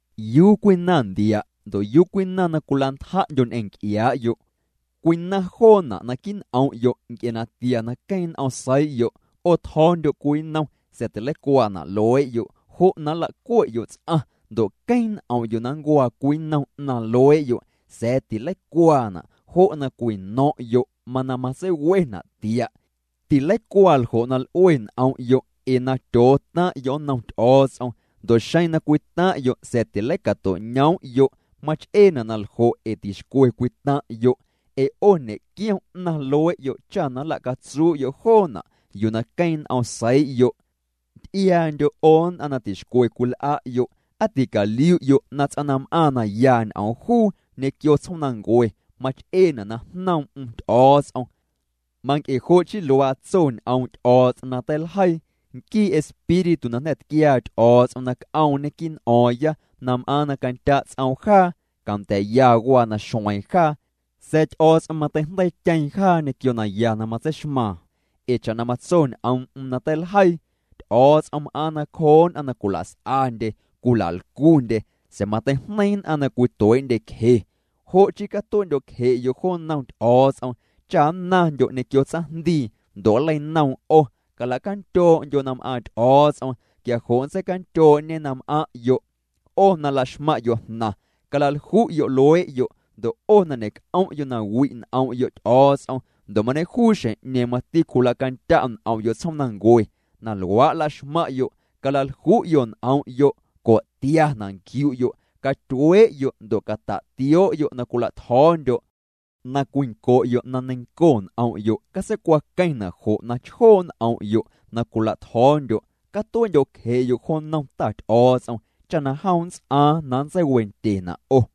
¿Yuu cwinaⁿ ndia', ndo' yuu cwinaⁿ na cwila'ntja'ndyo' ñ'eⁿ nc'iaa'yo'? Cwinaⁿ joona' naquii' n'om'yo' nc'e natia na queeⁿ n'om seii'yo'. 'O tjo̱o̱ndyo' cwii nnom, sa̱a̱ tileicuaana' luee'yo', jo' na nla'cue'yo' ts'aⁿ, ndo' queeⁿ n'om'yo' na nncuaa cwii nnom 'naⁿ luee'yo', sa̱a̱ tileicuaana', jo' na cwino̱ⁿ'yo' mana matseiwena' tia'. Tileicuaa ljo' na l'ue n'om'yo' ee na tyootaⁿ'yo' nnom Ty'o̱o̱ts'om. Ndo' xeⁿ na cwitaⁿ'yo' sa̱a̱ tileicato'ñoom'yo', mach'eena' na ljo' ee tixcwe cwitaⁿ'yo', ee 'o ñe'quiom 'naⁿ luee'yo' cha na nla'catsuu'yo' joona' yuu na queeⁿ n'om seii'yo'. Nty'iaandyo' 'o nn'aⁿ na tixcwe cwil'a'yo'. ¿Aa ticaliu'yo' na ts'aⁿ na m'aaⁿ na ya ñ'oom juu ñequio tsjoomnancue mach'eena' na jnoom'm Ty'o̱o̱ts'om? Manc'e jo' chii luaa tso ñ'oom' Ty'o̱o̱ts'om na teiljeii: “Nquii Espíritu na jnda̱ tquiaa Ty'o̱o̱ts'om na c'oomñê quii' n'o̱o̱ⁿya na m'aaⁿ na candya' ts'oom jaa, canda̱a̱'ya waa na xueeⁿ jaa.” Sa̱a̱ Ty'o̱o̱ts'om mateijndeiityeeⁿ jaa ñequio naya na matseixmaaⁿ. Ee cha'na matso ñ'oom'm na teiljeii: “Ty'o̱o̱ts'om m'aaⁿ nacjoo nn'aⁿ na cwilas'andye, cwila'lcundye, sa̱a̱ mateijneiⁿ nn'aⁿ na cwituee'ndyecje.” Jo' chii catue'ndyo'cje'yo' jo nnom Ty'o̱o̱ts'om cha nnaⁿndyo' ñequio tsaⁿjndii ndo' nleinoom 'o. Cala'candyoo'ndyo' na m'aaⁿ Ty'o̱o̱ts'om quia jo' nntseicandyoo'ñê na m'aⁿ'yo'. 'O na laxmaⁿ'yo' jnaⁿ, calalju'yo' luee'yo' ndo' 'o na ñe'c'om'yo' na wi' n'om'yo' Ty'o̱o̱ts'om ndo' mañejuu xjeⁿ mati cwila'candya' n'om'yo' tsjoomnancue, na luaa' laxmaⁿ'yo', calalju'yo' n'om'yo'. Co'tiana' nquiu'yo', catyuee'yo' ndo' cata'tio'yo' na cwila'tjo̱o̱ndyo'. Na cwinco'yo' na neiⁿnco n'om'yo', catseicwaqueⁿna' jo' na chjoo' n'om'yo' na cwila'tjo̱o̱ndyo'. Catue'ndyo'cje'yo' jo nnom Ta Ty'o̱o̱ts'om cha na jom nnts'aaⁿ na nntseiwendyena' 'o.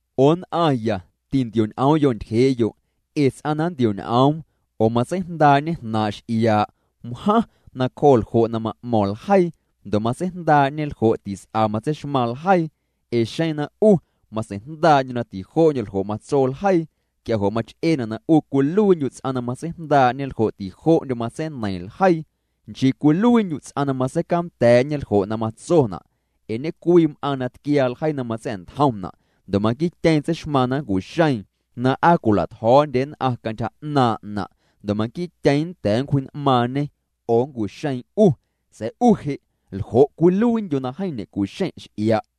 'O nn'aⁿya, tintio'ñ'oom'yo' ntyjee'yo'. Ee ts'aⁿ na nntio'ñ'oom oo matseijndaa'ñe jnaaⁿ' x'iaa', wjaⁿ nacjoo' ljo' na ma'mo̱ⁿ ljeii, ndo' matseijndaa'ñe ljo' tis'a matseixmaⁿ ljeii. Ee xeⁿ na 'u matseijndaa'ndyu' na tijo'ndyo ljo' matso ljeii quia jo' mach'eena' na 'u cwiluiindyu' ts'aⁿ na matseijndaa'ñe ljo' tijo'ndyo matseineiⁿ ljeii, nchii cwiluiindyu' ts'aⁿ na matseicanda̱a̱'ñe ljo' na matsona'. Ee ñecwii m'aaⁿ na tquiaa ljeii na matsa̱'ntjomna' ndo' manquiityeeⁿ tseixmaaⁿ na nncu'xeeⁿ na aa cwila'tjo̱o̱ndye nn'aⁿ cantyja 'naaⁿ'na' ndo' manquiityeeⁿ nnda̱a̱ nncwji'n'maaⁿñê oo nncu'xeeⁿ 'u. Sa̱a̱ 'u je', ¿ljo' cwiluiindyu' na jeeⁿ ñe'cu'xeⁿ' x'ia'?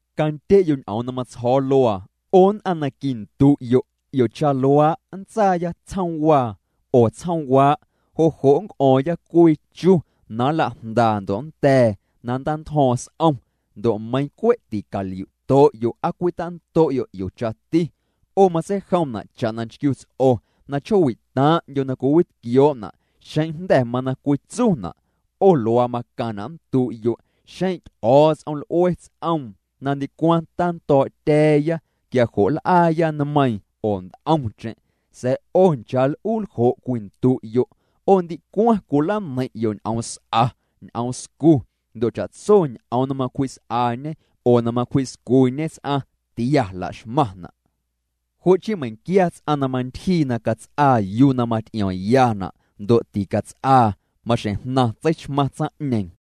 Candye'yo' ñ'oom na matsjo̱o̱ luaa, 'o nn'aⁿ na quindu'yo': “'Iocha luaa', nntsaaya tsjoomwaa oo tsjoomwaa', jo' jo' nnc'o̱o̱ⁿya cwii chu na nla'jndaa ndo' nnda̱a̱ na nntantjo̱o̱ⁿ s'om.” Ndo' meiⁿ cwe' ticaliu'to'yo' aa cwintando'yo' 'iochati. 'O matseijomna' cha'na nchquiuts'o na chjoowi'taⁿ'ndyo na cwiwitquioo'na' xeⁿ jnda̱ mana cwitsuna'. 'O luaa macaⁿna' nndu'yo': “Xeⁿ Ty'o̱o̱ts'om l'ue ts'oom na ndicwaⁿ tando̱o̱'tya̱a̱ya, quia jo' nl'aaya nmeiiⁿ oo nt'omcheⁿ.” Sa̱a̱ 'o nchaa l'uu ljo' cwindu'yo', 'o ndicwaⁿ cwilaneiⁿ'yo' ñ'ooms'a, ñ'oomscu, ndo' cha'tso ñ'oom na macwji's'añe oo na macwji'scuñe ts'aⁿ tia laxmaⁿna'. Jo' chii meiⁿquia ts'aⁿ na mantyjii na cats'aa yuu na maty'iomyana', ndo' ticats'aa, maxjeⁿ jnaⁿ tseixmaⁿ tsaⁿ'ñeeⁿ.